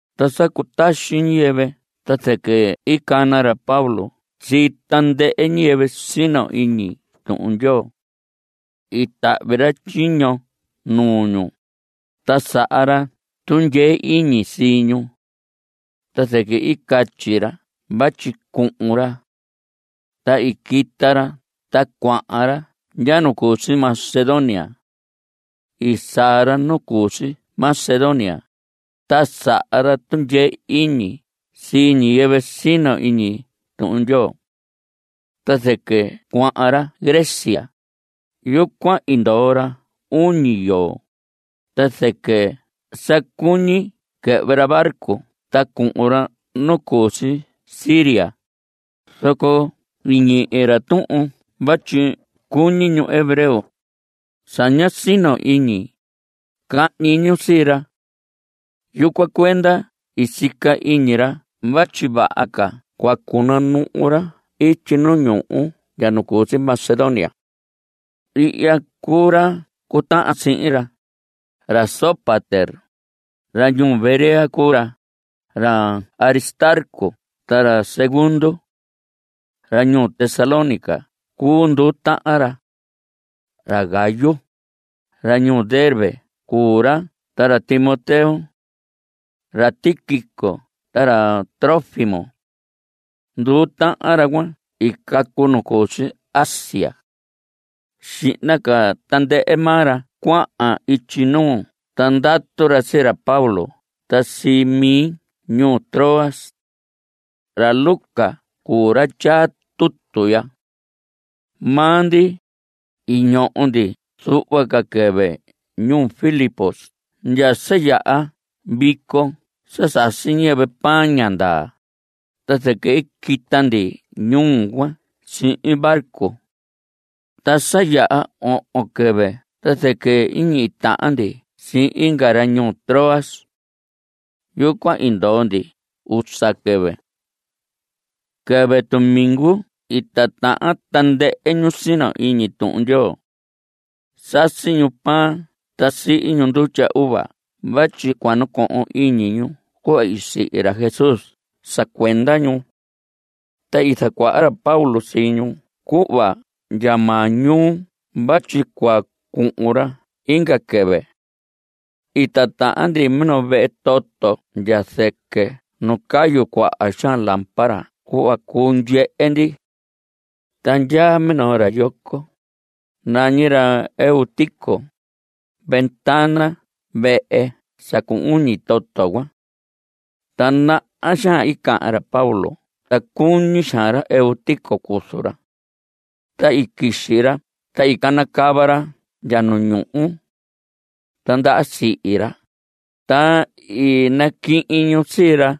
Ta sa cutaxi ñiyɨvɨ ta zɨquɨ i cana ra Pablo sii tandɨhɨ ñiyɨvɨ sino iñi Tuhun Ndyoo. I tahvi ra tyiño nuu ñu, ta saha ra tundyee iñi sii ñu. Ta zɨquɨ i catyi ra vatyi cuhun ra. Ta i quita ra ta cuahan ra ndya nu cu si Macedonia. I saa ra nu cu si Macedonia, ta saha ra tundyee iñi sii ñiyɨvɨ sino iñi Tuhun Ndyoo. Ta zɨquɨ cuahan ra Grecia. Yucuan i ndoo ra uñi yoo, ta zɨquɨ sa cuñi quɨhvɨ ra barco ta cuhun ra nu cu si Siria, zoco i ñihi ra tuhun vatyi cuñi ñu hebreo, sa ña sino iñi, cahñi ñu sii ra. Yucuan cuenda i sica iñi ra vatyi vaha ca cua cunuhu ra ityi nu ñuhu ndya nu cu si Macedonia. Ihya cuu ra cutahan sihin ra. Ra Sópater, ra ñuu Berea cuu ra, ra Aristarco ta ra Segundo. Ra ñuu Tesalónica cuu nduu tahan ra. Ra Gayo, ra ñuu Derbe cuu ra ta ra Timoteo. Ra Tíquico ta ra Trófimo. Nduu tahan ra cuan i cacu nu cu si Asia. Xihna ca tandɨhɨ maa ra cuahan ityi nuu ta ndatu ra sii ra Pablo ta sii mi ñuu Troas. (Ra Lucas cuu ra tyaa tutu ya.) Maa ndi, i ñoho ndi zuhva ca quɨvɨ ñuu Filipos ndya sa yaha vico sa sasi ñiyɨvɨ pan ña ndaa, ta zɨquɨ i quita ndi ñuu cuan sihin barco. Ta sa yaha ohon quɨvɨ ta zɨquɨ i ñihi tahan ndi sihin inga ra ñuu Troas. Yucuan i ndoo ndi usa quɨvɨ. Quɨvɨ tumingu i tatahan tandɨhɨ ñu sino iñi Tuhun Ndyoo. Sasi ñu pan ta sihi ñu ndutya uva vatyi cua nacohon iñi ñu cuhva sihi ra Jesús sa cuenda ñu. Ta i zacuaha ra Pablo sii ñu cuhva ndya maañuu vatyi cua cuhun ra inga quɨvɨ. I titahan ndi minoo vehe toto ndya zɨquɨ nu cayu cuaha xaan lámpara (cuhva cuu ndyehe ndi). Ta ndyaa minoo ra yoco, nañi ra Eutico, ventana vehe sa cu uñi toto cuan. Ta naha xaan i cahan ra Pablo ta cuñi xaan ra Eutico cuzu ra. Ta i quixi ra ta i canacava ra ndya nu ñuhu. Ta ndaha sihi ra, ta i naquihin ñu sii ra.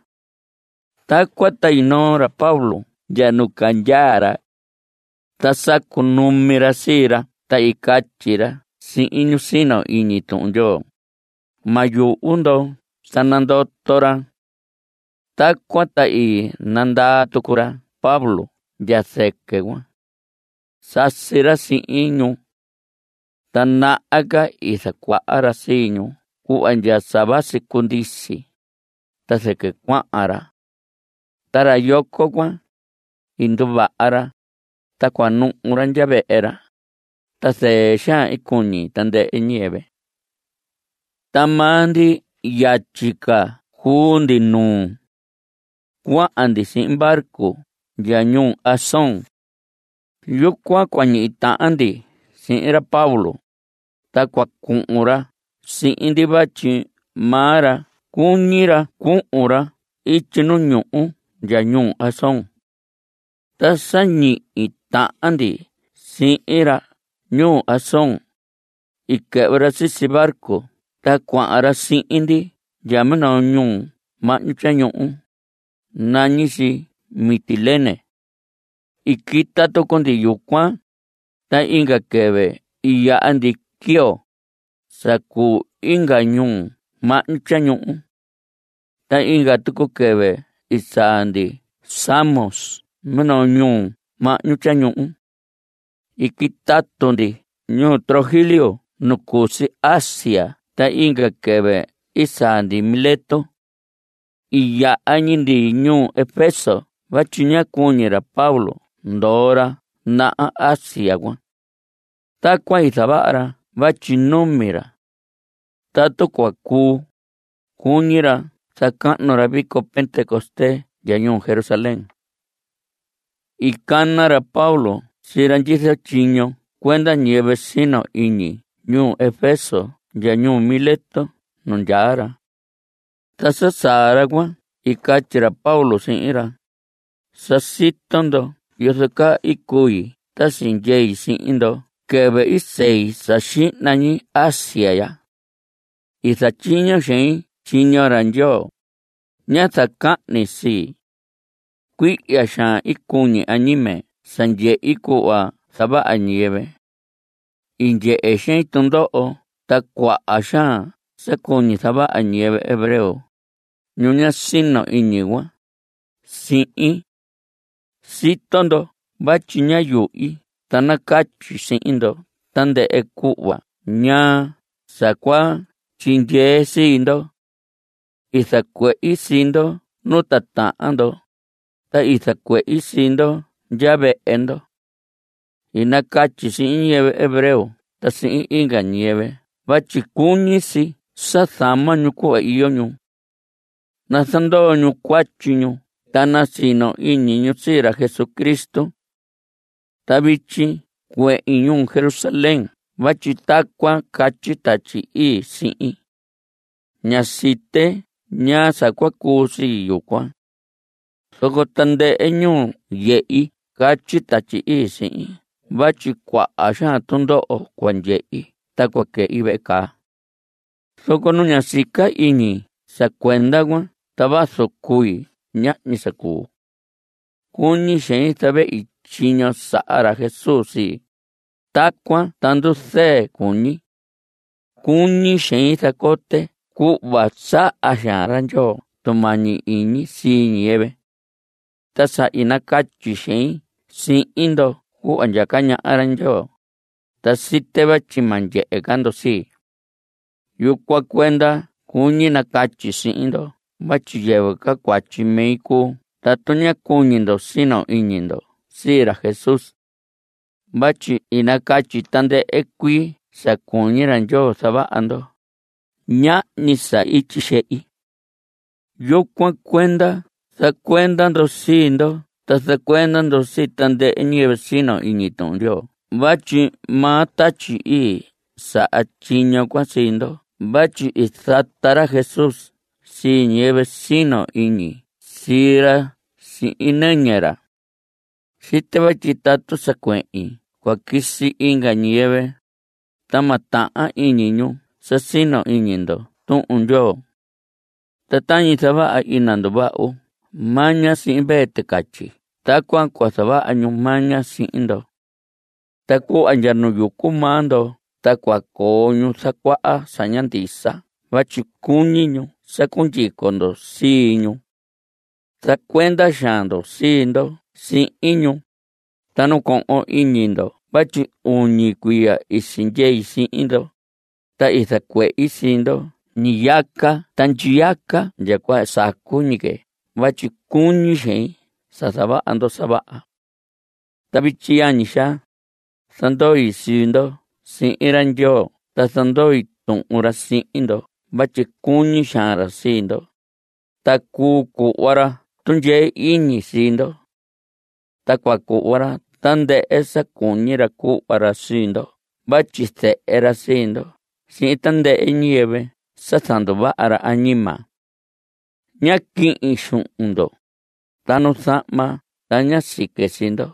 Tacuan ta i noo ra Pablo ndya nu candyaa ra. Ta sa cunumi ra sii ra ta i catyi ra sihin ñu sino iñi Tuhun Ndyoo: Ma yuhu ndo. Sa nandoto ra. Tacuan ta i nandaa tucu ra Pablo ndya zɨquɨ cuan. Sasi ra sihin ñu, ta naha ca i zacuaha ra sii ñu cuhva ndya sa vasi cundisi. Ta zɨquɨ cuahan ra. Ta ra yoco cuan, i nduvaha ra, ta cuanuhu ra ndya vehe ra. Ta zɨɨ xaan i cuñi tandɨhɨ ñiyɨvɨ. Ta maa ndi yatyi ca cuu ndi nuu. Cuahan ndi sihin barco ndya ñuu Asón. Yucuan cua ñihi tahan ndi sihin ra Pablo, ta cua cuhun ra sihin ndi. Vatyi maa ra cuñi ra cuhun ra ityi nu ñuhu ndya ñuu Asón. Ta sa ñihi tahan ndi sihin ra ñuu Asón, i quɨhvɨ ra sisi barco ta cuahan ra sihin ndi ndya minoo ñuhu mahñu tyañuhu. Nañi si Mitilene. I quita tucu ndi yucuan, ta inga quɨvɨ i yaha ndi Quío, sa cuu inga ñuhu mahñu tyañuhu. Ta inga tucu quɨvɨ i saa ndi Samos minoo ñuhu mahñu tyañuhu. I quitatu ndi ñuu Trogilio nu cu si Asia ta inga quɨvɨ i saa ndi Mileto. I yaha ñi ndi ñuu Efeso vatyi ñá cuñi ra Pablo ndoo ra naha Asia cuan. Tacuan i zavaha ra vatyi numi ra. Tatu cua cuu, cuñi ra zacahnu ra vico Pentecostés ndya ñuu Jerusalén. I cana ra Pablo sii ra ndyizo tyiño cuenda ñiyɨvɨ sino iñi ñuu Efeso ndya ñuu Mileto nu ndyaa ra. Ta sa saa ra cuan i catyi ra Pablo sihin ra: Sa sito ndo yozo caa i cui ta sindyei sihin ndo quɨvɨ i sei sa xihna ñi Asia ya. I zatyiño xein tyiño ra Ndyoo. Ñá zacahni sii. Cuihya xaan i cuñi añime sa ndyehi cuhva zavaha ñiyɨvɨ. I ndyehe xein tundoho ta cuaha xaan sa cuñi zavaha ñiyɨvɨ hebreo, ñu ña sino iñi cuan, sihin. Sito ndo vatyi ñá yuhi ta nacatyi sihin ndo tandɨhɨ cuhva ñaa sa cua tyindyee sii ndo. I zacuehi sii ndo nu titahan ndo. Ta i zacuehi sii ndo ndya vehe ndo. I nacatyi sihin ñiyɨvɨ hebreo ta sihin inga ñiyɨvɨ vatyi cuñi si sa zama ñu cuhva iyo ñu. Nazandoo ñu cuatyi ñu ta nasino iñi ñu sii ra Jesucristo. Ta vityi cuehin ñuu Jerusalén vatyi tacuan catyi Tatyi Ii sihin. Ña site ñaa sa cua cuu sii yucuan. Zoco tandɨhɨ ñuu yehi catyi Tatyi Ii sihin vatyi cuaha xaan tundoho cua ndyehi ta cua quɨhi vehe caa. Zoco nu ña sica iñi sa cuenda cuan ta vazu cui ñahñi sa cuu. Cuñi xein zavehi tyiño saha ra Jesús sii. Tacuan ta nduzɨɨ cuñi. Cuñi xein zacote cuhva saha xaan ra Ndyoo tumañi iñi sii ñiyɨvɨ. Ta sa i nacatyi xein sihin ndo cuhva ndyaca ñaha ra Ndyoo, ta site vatyi ma ndyehe ca ndo sii. Yucuan cuenda cuñi nacatyi sihin ndo vatyi yɨvɨ ca cuatyi mi cuu tatu ña cuñi ndo sino iñi ndo sii ra Jesús. Vatyi i nacatyi tandɨhɨ cuii sa cuñi ra Ndyoo zavaha ndo. Ñahñi sa i tyixehi. Yucuan cuenda zacuenda ndo sii ndo ta zacuenda ndo sii tandɨhɨ ñiyɨvɨ sino iñi Tuhun Ndyoo vatyi maa Tatyi Ii saha tyiño cuan sii ndo vatyi i zata ra Jesús sii ñiyɨvɨ sino iñi sii ra sihin nɨñɨ ra. Site vatyi tatu sa cuehin cua quisi inga ñiyɨvɨ, ta ma tahan iñi ñu sa sino iñi ndo Tuhun Ndyoo. Ta tañi zavaha ina nduvahu maña sii mvee ticatyi tacuan cua zavaha ñu maña sii ndo. Ta cuhva ndya nu yucu maa ndo ta cua coo ñu zacuaha sa ña ndisa vatyi cuñi ñu sa cundyico ndo sii ñu. Zacuenda xaan ndo sii ndo sihin ñu. Ta nacohon iñi ndo vatyi uñi cuiya i sindyei sihin ndo, ta i zacuehi sii ndo ñiyaca ta ndyiyaca ndya cuhva sacu ñi que vatyi cuñi xein sa zavaha ndo sa vaha. Ta vityi, yañi xaa, zandoi sii ndo sihin ra Ndyoo ta zandoi Tuhun ra sihin ndo vatyi cuñi xaan ra sii ndo, ta cuu cuhva ra tundyee iñi sii ndo. Ta cua cuhva ra tandɨhɨ sa cuñi ra cuhva ra sii ndo vatyi zehe ra sii ndo sihin tandɨhɨ ñiyɨvɨ sa zanduvaha ra añima. Ñá quihin xuhun ndo, ta nu zahma ta ñá sique sii ndo.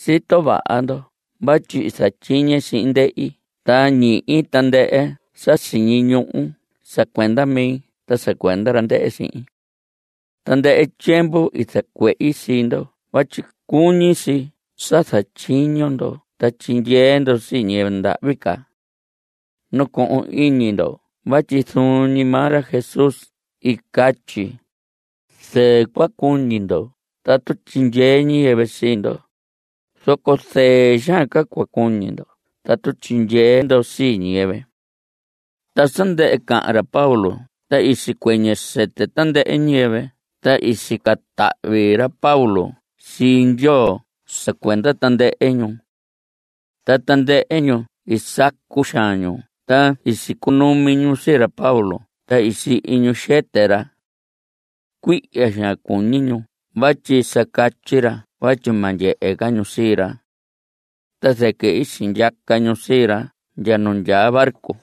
Sito vaha ndo vatyi i zatyiñe sihin ndehi ta ñihi tandɨhɨ sa siñi ñuhu sa cuenda mi ta sa cuenda ra ndɨhɨ sihin. Tandɨhɨ tyiemvu i zacuehi sii ndo vatyi cuñi si sa zatyiño ndo ta tyindyee ndo sii ñiyɨvɨ ndahvi ca. Nacohon iñi ndo vatyi zuun ñi maa ra Jesús i catyi: “Zɨɨ cua cuñi ndo tatu tyindyee ñiyɨvɨ sii ndo, zoco zɨɨ xaan ca cua cuñi ndo tatu tyindyee ndo sii ñiyɨvɨ.” Ta sa ndɨhɨ cahan ra Pablo ta i sicuɨñɨ sɨtɨ tandɨhɨ ñiyɨvɨ ta i sica tahvi ra Pablo sii Ndyoo sa cuenda tandɨhɨ ñu. Ta tandɨhɨ ñu i sacu xaan ñu ta i sicunumi ñu sii ra Pablo ta sihi ñu xɨtɨ ra. Cuihya xaan cuñi ñu vatyi sa catyi ra vatyi ma ndyehe ca ñu sii ra. Ta zɨquɨ i sindyaca ñu sii ra ndya nu ndyaa barco.